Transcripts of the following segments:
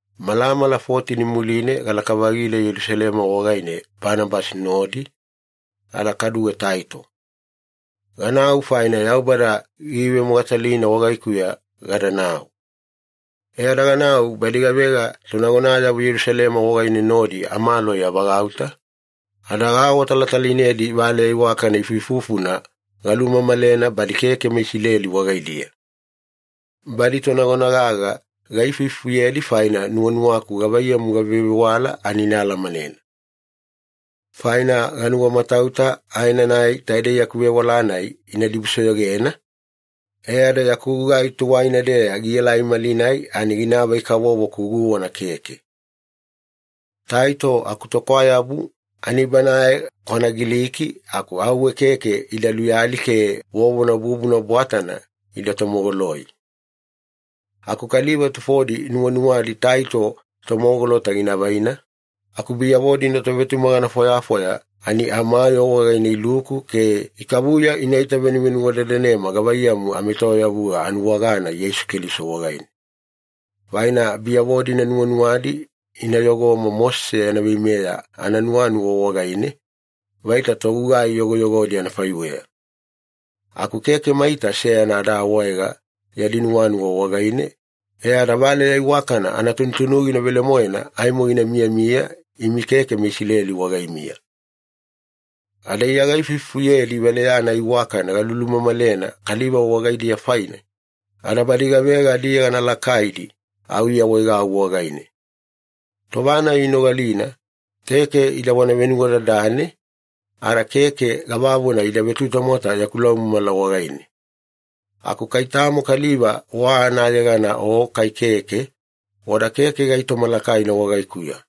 Malamala fotini muline galaka-vagila Yelusalema wagaine Banabasi nodi, ada kaduwe Taito. Ganau faina Yaubada giivemogatalina wagaikuya gadanau. E ada ganau badi gavega tonagonayavo Yelusalema wagaine nodi amaloi avagauta, ada gaawatalatalainedi valeya iwakana ifuifufuna galumamalena badi keke meIsileli wagaidiya. Badi tonagona gaga gaifuifufuyedi faina nuwanuwaku gavaiyamu gavevewala ani ina alamanena. Faina ganuwamatauta aenanai taidei yaku vewala-nai ina dibusoyogena, e ada yaku gugai tuwaina-deya gielai malinai ani ginaavai-kavovo-ku guwana keke. Taito akutokwayabu, ani banae kwana Giliki aku auwe keke ida luyali ke vovona bubuna bwatana ida tomogoloi. Aku kaliva tufodi nuwanuwadi Taito tomogolota gina vaina, aku biyavo-dina tovetumagana fwayafwaya ani amayoo wagaine iluku ke ikavuya inaita venuvenuwadadanema gavaiyamu amaetoyavuga anuwagana Yeisu Keliso wagaine. Faina biyavo-dina nuwanuwadi ina yogoma Mosese yana veimeya ananuwanuwa wagaine, vaita togugai yogoyogodi anafaiweya. Aku keke maita seyana ada awaega yadi nuwanuwa wagaine, e ada valeya iwakana anatunutunugina velemoena aimo gina miyamiya imi keke meIsileli wagaimiya. Ada Iya gaifufuyedi valeya-nai iwakana galulumamalena kaliva wagaidiya faine, ada badi gavega adiyegana lakaidi au iawaegau wagaine. Tova-nai inogalina, keke idavona venuwadadane, ada keke gavavona ida vetutamwata yaku laumamala wagaine. Aku kai tamo kaliva wa anayegana o kai keke, wada keke gaitoma lakaina wagaikuya.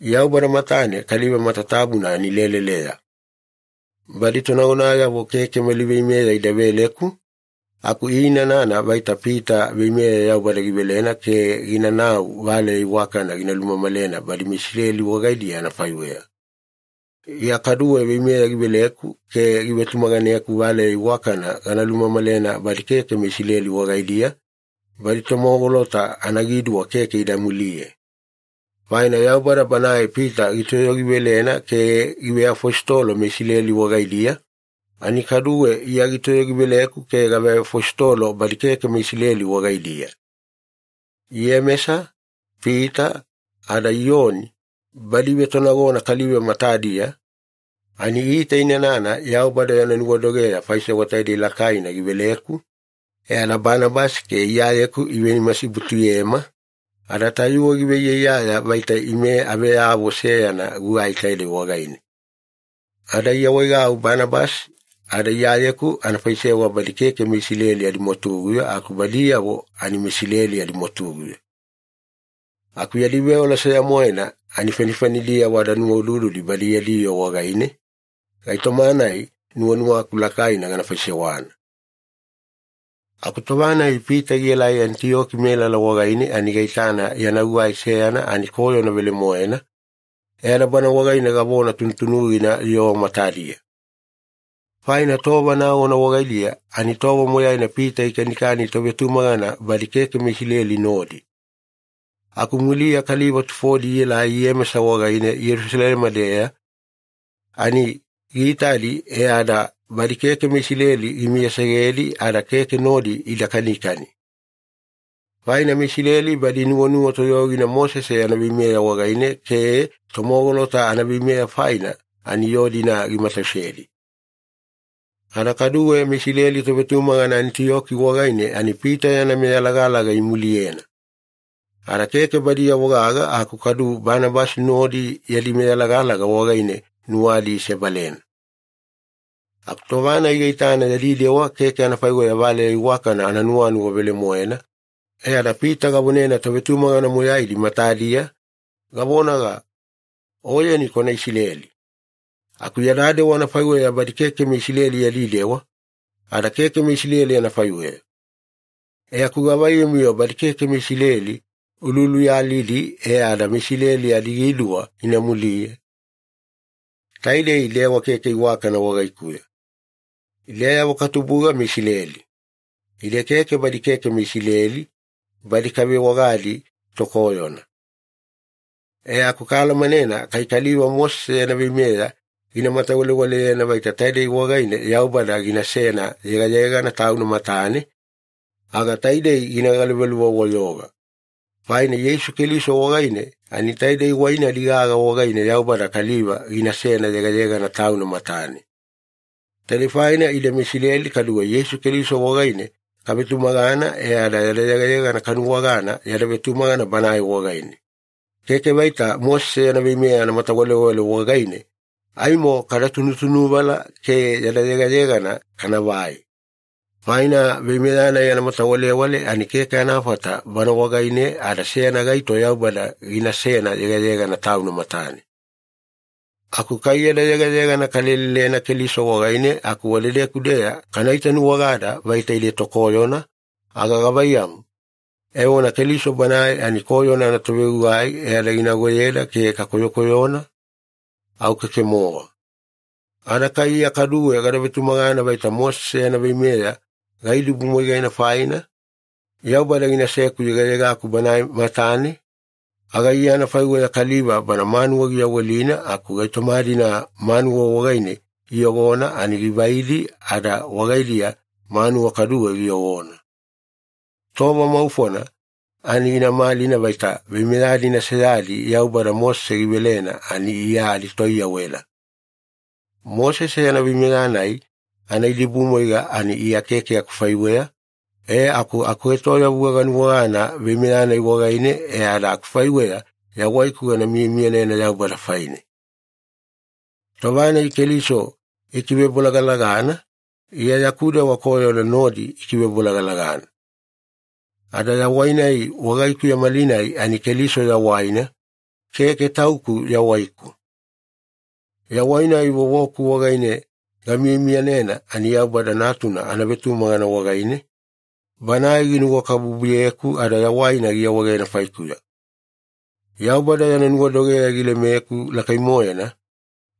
Yaubada matane kaliva matatabuna ani leleleya. Badi tonagonayavo keke mali veimeya ida veleku, aku iinanana vaita Pita veimeya Yaubada givelena ke ginanau valeya iwakana gina lumamalena badi meIsileli wagaidiya anafaiweya, Iya kaduwe veimeya giveleku ke givetumaganeku valeya iwakana gana lumamalena badi keke meIsileli wagaidiya, badi tomogolota anagiduwa keke ida muliye. Faina Yaubada Banae Pita gitoyogivelena ke giveafositolo meIsileli wagaidiya, ani kaduwe Iya gitoyogiveleku ke gaveafositolo badi keke meIsileli wagaidiya. Iyemesa, Pita, ada Iyoni, badi ivetonagona kaliva matadiya, ani iitainana Yaubada yana nuwadogeya faisewa taidei lakaina giveleku, e ada Banabasi ke Iyayeku ivenimasibutuyema, ada tayuwe giveiyaiyaya vaita ime aveyavo seyana gugai taidei wagaine. Ada iawaegau Banabasi ada Iyayeku ana faisewa badi keke meIsileli adimwatuguya aku badiyavo ani meIsileli adimwatuguya. Aku yadi veola seya-moena ani fanifanidiyavo ada nuwaudududi badi yadi yoo wagaine, gaitoma-nai nuwanuwaku lakaina gana faisewana. Aku tova-nai Pita gielai Anitiyoki melala wagaine ani gaitana yana gugai seyana ani koyona velemoena, e ada bana wagaine gavona tunutunugina yoo matadiya. Faina tova nagona wagaidiya ani tova moyaina Pita gikanikani tovetumagana badi keke meIsileli nodi. Aku muliya kaliva tufodi ielai Iyemesa wagaine Yelusalema-deya, ani giitadi e ada badi keke meIsileli gimiyasegedi ada keke nodi ida kanikani. Faina meIsileli badi inuwanuwa toyogina Mosese yana veimeya wagaine ke tomogolota anaveimeya faina ani yoo-dina gimatausedi. Ada kaduwe meIsileli tovetumagana Anitiyoki wagaine ani Pita yana meyalagalaga imuliyena. Ada keke badiyavo gaga aku kadu Banabasi nodi yadi meyalagalaga wagaine nuwadi isebalena. Aku tova-nai gaitana yadi dewa keke anafaiweya valeya iwakana ananuwanuwa velemoena, e ada Pita gavonena tovetumagana moyaidi matadiya, gavonaga, “Oyeni kwana Isileli. Aku ya dewa anafaiweya badi keke meIsileli yadi dewa, ada keke meIsileli anafaiweya. E aku gavaiyamu-yo badi keke meIsileli ululuyalidi e ada meIsileli adagiduwa ina muliye? Taidei dewa keke iwakana wagaikuya.” Ideyavo katubuga meIsileli. Ide keke badi keke meIsileli, badi kavewagadi ‘tokoyona’. E aku kaalamanena kai kaliva Mosese yana veimeya gina matawalewaleyena vaita taidei wagaine Yaubada ginasena yegayegana Tauna matane, aga taidei gina galuvaluva-wayoga. Faina Yeisu Keliso wagaine ani taidei wai-nai gaga wagaine Yaubada kaliva ginasena yegayegana Tauna matane. Taidei faina ide meIsileli kaduwe Yeisu Keliso wagaine kavetumagana e ada yada yegayegana kanuwagana yada vetumagana Banae wagaine. Keke vaita Mosese yana veimeya anamatawalewale wagaine aimo kada tunutunuvala ke yada yegayegana kanavai. Faina veimeya-nai anamatawalewale ani keke anafata bana wagaine ada seyana gaito Yaubada ginasena yegayegana Tauna matane. Aku kai yada yegayegana kalelelena Keliso wagaine aku wadedeku-deya kana itanuwagada vaita ide tokoyona, aga gavaiyamu, evona Keliso Banae ani koyona anatovegugai e ada ginagoyeda ke kakoyokoyona? Au keke-mowa. Ada kai Iya kaduwe gada vetumagana vaita Mosese yana veimeya gaidibumwaigena faina, Yaubada ginaseku yegayegaku Banae matane, aga Iya anafaiweya kaliva bana manuwa giyawelina aku gaitoma-dina manuwa wagaine iyogona ani givaidi ada wagaidiya manuwa kaduwe giyogona. Tova maufona ani gina malina vaita veimeya-dina seyadi Yaubada Mosese givelena ani Iya aditoiyawela. Mosese yana veimeya-nai anaidibumwaiga ani Iya keke akufaiweya, e aku akuetoyavuga ganuwagana veimeya-nai wagaine e ada akufaiweya yawaiku gana miyamiyanena Yaubada faine. Tova-nai Keliso ikivebolagalagana, Iya yaku dewa koyona nodi ikivebolagalagana. Ada yawai-nai wagaikuya malinai ani Keliso yawaina, keke tauku yawaiku. Yawai-nai vovoku wagaine gamiyamiyanena ani Yaubada Natuna anavetumagana wagaine, Banae ginuwakabubuyeku ada yawaina giawaegena faikuya. Yaubada yana nuwadogeya gilemeku lakai-moena,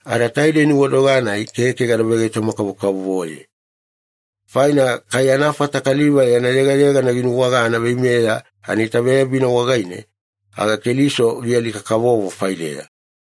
ada taidei nuwadoga-nai keke gada vegaitoma-kavokavovoye. Faina kai anafata kaliva yana yegayegana ginuwagana veimeya anaitaveyabina wagaine, aga Keliso gialika-kavovo faideya.